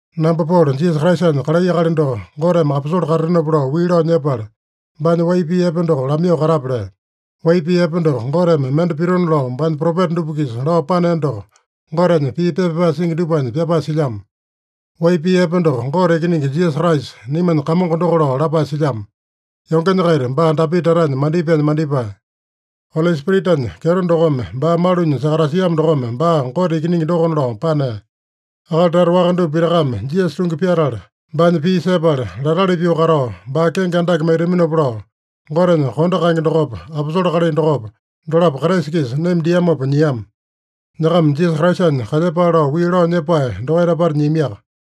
Namba Polo, Jisasa Kraisanya kalai akali doko, Goteme aposole katatenopa lao wii lao nyepala, baanya wai pii epe doko lamaiyoo katape lea. Wai pii epe doko, Goteme mende pitona lao baanya propeta dupa-kisa lao panea doko Gotenya pii pepa pyapae singi dupanya pyapae silyamo. Wai pii epe doko Gote Ikiningi Jisasa Kraisa, naimanya Kamongo doko lao lapae silyamo. Yongenya-kaita baa Dapita tatanya mandipaenya mandipae. Oli Spiritanya kyeto dokome baa malunya sakatasiamo dokome baa Gote Ikiningi dokona lao panea. Akali tata waka dupa pitakame Jisasa tungi pyatala, baanya pii sepala latali pyoo katao, baa kenge andake maitaminopa lao, Gotenya kondo kaenge dokopa, aposole kalai dokopa, dolapo Kraisa-kisa naima diamopa nyiama. Nyakama Jisasa Kraisanya kalyepale lao wii lao nyepae dokaita apata nyiamiaka.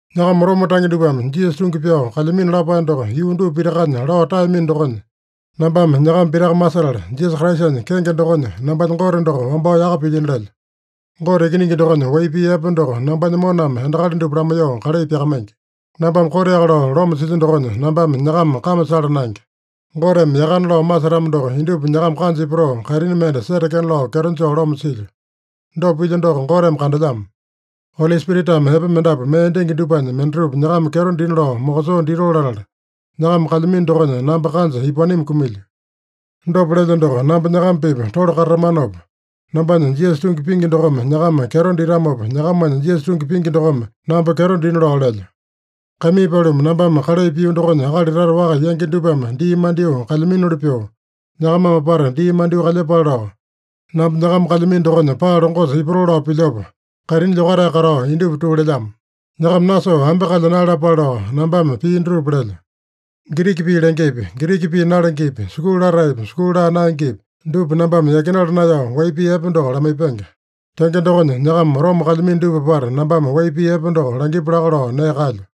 Nyakama Roma tange dupame Jisasa tungi pyao kalyamino lapae doko yuu dupa pitakanya lao taeyamino dokonya, nambame nyakama pitaka masetala, Jisasa Kraisanya kenge dokonya nambanya Gote doko wambao yaka pilyino lelyo. Gote Ikiningi dokonya wai pii epe doko nambanya moname endakali dupa lamaiyoo kalai pyakamaingi. Nambame koteaka lao loma silyo dokonya nambame nyakama kame sala naenge. Goteme yakana lao masetamo doko, indupa nyakama kanja ipatoo, kaitini mende setekena lao kyeto joo loma silyo. Dopa pilyo doko Goteme kandelyamo. Oli Spiritame epe mendapu mee dingi dupanya mendatupa nyakama kyeto dina lao mokosoo ditoo latala, nyakama kalyamino dokonya namba kanja ipaowanimi kumilyo. Dopa lelyo doko, namba nyakama-pipa tole katatamanopa, nambanya Jisasa tungi pingi dokome nyakama kyeto ditamopa, nyakamanya Jisasa tungi pingi dokome namba kyeto dina lao lelyo. Kaimii paluma, nambame kalai pio dokonya akali tata waka yangi dupame dii mandyoo kalyaminoli pyoo, nyakamame apata dii mandyoo kalyepale lao, namba nyakama kalyamino dokonya paa longosa ipatoo lao pilyopa, kaitini lyokatae katao indupa tuu lelyamo. Nyakama nasoo ambe kalya naeyalapale lao nambame pii dutupa lelyo. Giriki pii lengepi, Giriki pii nalengepi, sukulu lataepi, sukulu laa naengepi, dupa nambame yakinala naeyao wai pii epe doko lamaipenge. Tenge dokonya, nyakama Roma kalyamino dupa apata nambame wai pii epe doko langipu laka lao nee kaelyo.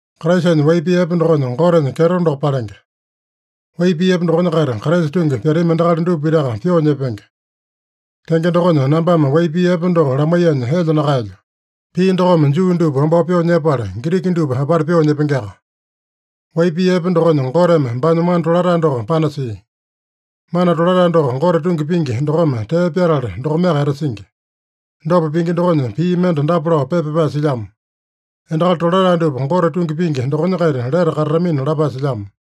Kraisanya wai pii epe dokonya, Gotenya kyeto doko palenge. Wai pii epe dokonya-kaita Kraisa tungi pyatami endakali dupa pitaka pyoo nyepenge. Tenge dokonya, nambame wai pii epe doko lamaiyanya elya nakaelyo. Pii dokome Juu dupa wambao pyoo nyepala, Giriki dupa apata pyoo nyepengeaka. Wai pii epe dokonya Goteme baanya mana tolatae doko panasia. Mana tolatae doko Gote tungi pingi dokome tee pyatala, dokomeaka etasingi. Dopa pingi dokonya pii mende dapa lao pepa pyapae silyamo: “Endakali tolatae dupa Gote tungi pingi dokonya-kaita lete katatamina” lapae silyamo.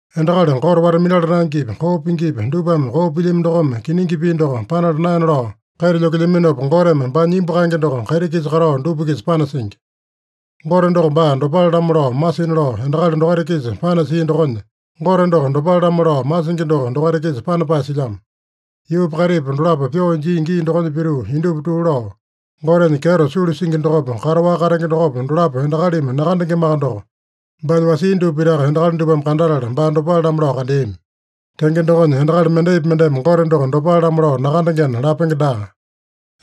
Endakali Gote wata-minala naengepi, koo pingipi, dupame koo pilyami dokome kiningi pii doko panala naena lao kaita lyokelyaminopa, Goteme baanya imbu kaenge doko kaiti-kisa katao dupa-kisa panasingi. Gote doko baa dopale-lamo lao masina lao endakali dokaita-kisa panasia dokonya, Gote doko dopale-lamo lao masingi doko dokaita-kisa panapae silyamo. Yuupa kaitipa dolapo pyoo injia gii dokonya pituu, indupa tuu lao, Gotenya kyeto sulu singi dokopa, kataowaka katenge dokopa, dolapo endakalimi nakandengemaka doko, baanya wasia dupa pitaka endakali dupame kandatala baa dopale-lamo lao kandeami. Tenge dokonya, endakali mendaipi mendeme Gote doko dopale-lamo lao nakandengena lapenge daa.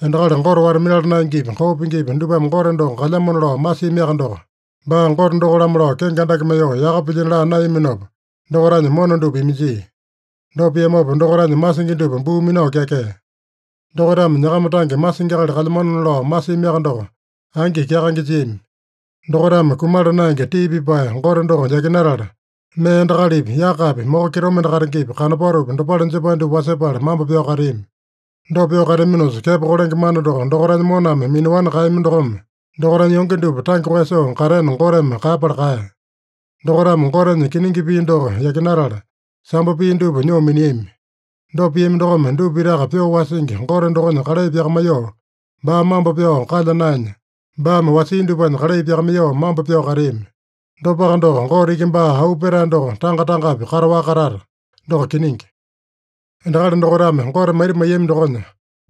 Endakali Gote wata-minala naengepi, koo pingipi, dupame Gote doko kalyamona lao masiamiaka doko, baa Gote doko-lamo lao kenge andake maiyoo, yaka pilyino laa naeyaminopa, dokaitanya mona dupa iminjia. Dopa piamopa dokaitanya masingi dupa buu minao kyakea. Dokaitame nyakama tange masingi akali kalyamanona lao masiamiaka doko, angi kyakaenge jiami. Dokaitame kumala naenge tii pipae Gote doko yakinatala, mee endakalipi, yakapi, moko kitomende katengepi, kanopatopi, dopale jepae dupa wasepala mambo pyao kateami. Dopa pyoo kateaminosa, kepo kolenge mana doko dokaitanya moname minaowani kaeyami dokome, dokaitanya yonge dupa tange koeyasoo katena Goteme kaeyapala kaeya. Dokaitame Gotenya kiningi pii doko yakinatala, sambo pii dupa nyoo miniami. Dopa piami dokome, dupa pitaka pyoo wasingi Gote dokonya kalai pyakamaiyoo baa mambo pyao kalya naenya, baame wasia dupanya kalai pyakamaiyoo mambo pyao kateami. Dopaka doko, Gote iki baa auu petae doko tanga-tangapi kataowaka katata. Doko kiningi. Endakali dokaitame Gote maita maiyami dokonya,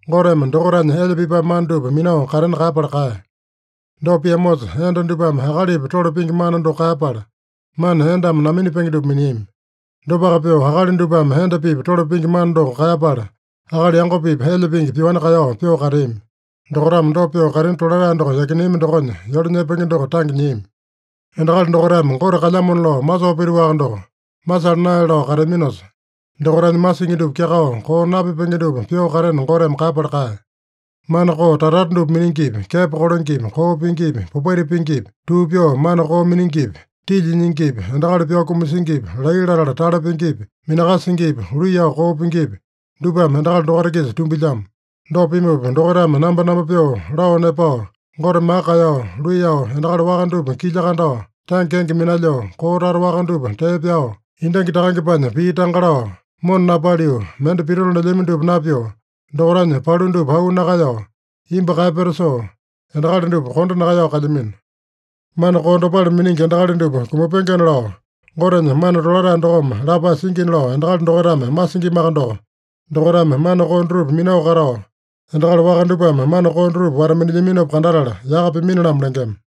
Goteme dokaitanya elya pipae mana dupa minao katena kaeyapala kaeya. Dopa piamosa, enda dupame akalipa tole pingi mana doko kaeyapala, mana endame naminapenge dupa miniami. Dopaka pyoo akali dupame enda-pipa tole pingi mana doko kaeyapala, akali yango-pipa elya pingi pyoani kaeyao pyoo kateami. Dokaitame dopa pyoo kaitini tolatae doko yakineami dokonya, yole nyepenge doko tange nyiami. Endakali dokaitame Gote kalyamona lao masoo pituaka doko, masala naele lao kateaminosa, dokaitanya masingi dupa kyakao, koo napipenge dupa pyoo katena Goteme kaeyapala kaeya. Mana koo tata-tata dupa miningipi, kepo kolengepi, koo pingipi, popaita pingipi, tuu pyoo mana koo miningipi, tilya nyingipi, endakali pyao kumasingipi, laiya latala tale pingipi, minakasingipi, luiyao koo pingipi, dupame endakali dokaita-kisa tumbilyamo. Dopa pimupa, dokaitame nambonambo pyoo, lao nepao, Gote maka kaeyao, luiyao, endakali waka dupa kilya kandao, tange kenge minalyoo, koo tata waka dupa tee pyao, endangi takangepanya pii tanga lao, mona napaliu, mende pitona lelyami dupa napyoo, dokaitanya palu dupa auu nakaeyao, imbu kaeyapeta soo, endakali dupa kondo nakaeyao kalyamino. Mana koo dopale miningi endakali dupa kumapengena lao, Gotenya mana tolatae dokome lapae singina lao endakali dokaitame masingimaka doko, dokaitame mana koo dutupa minao katao, endakali waka dupame mana koo dutupa wata-minilyaminopa kandatala, yaka pimini-lamo lengema.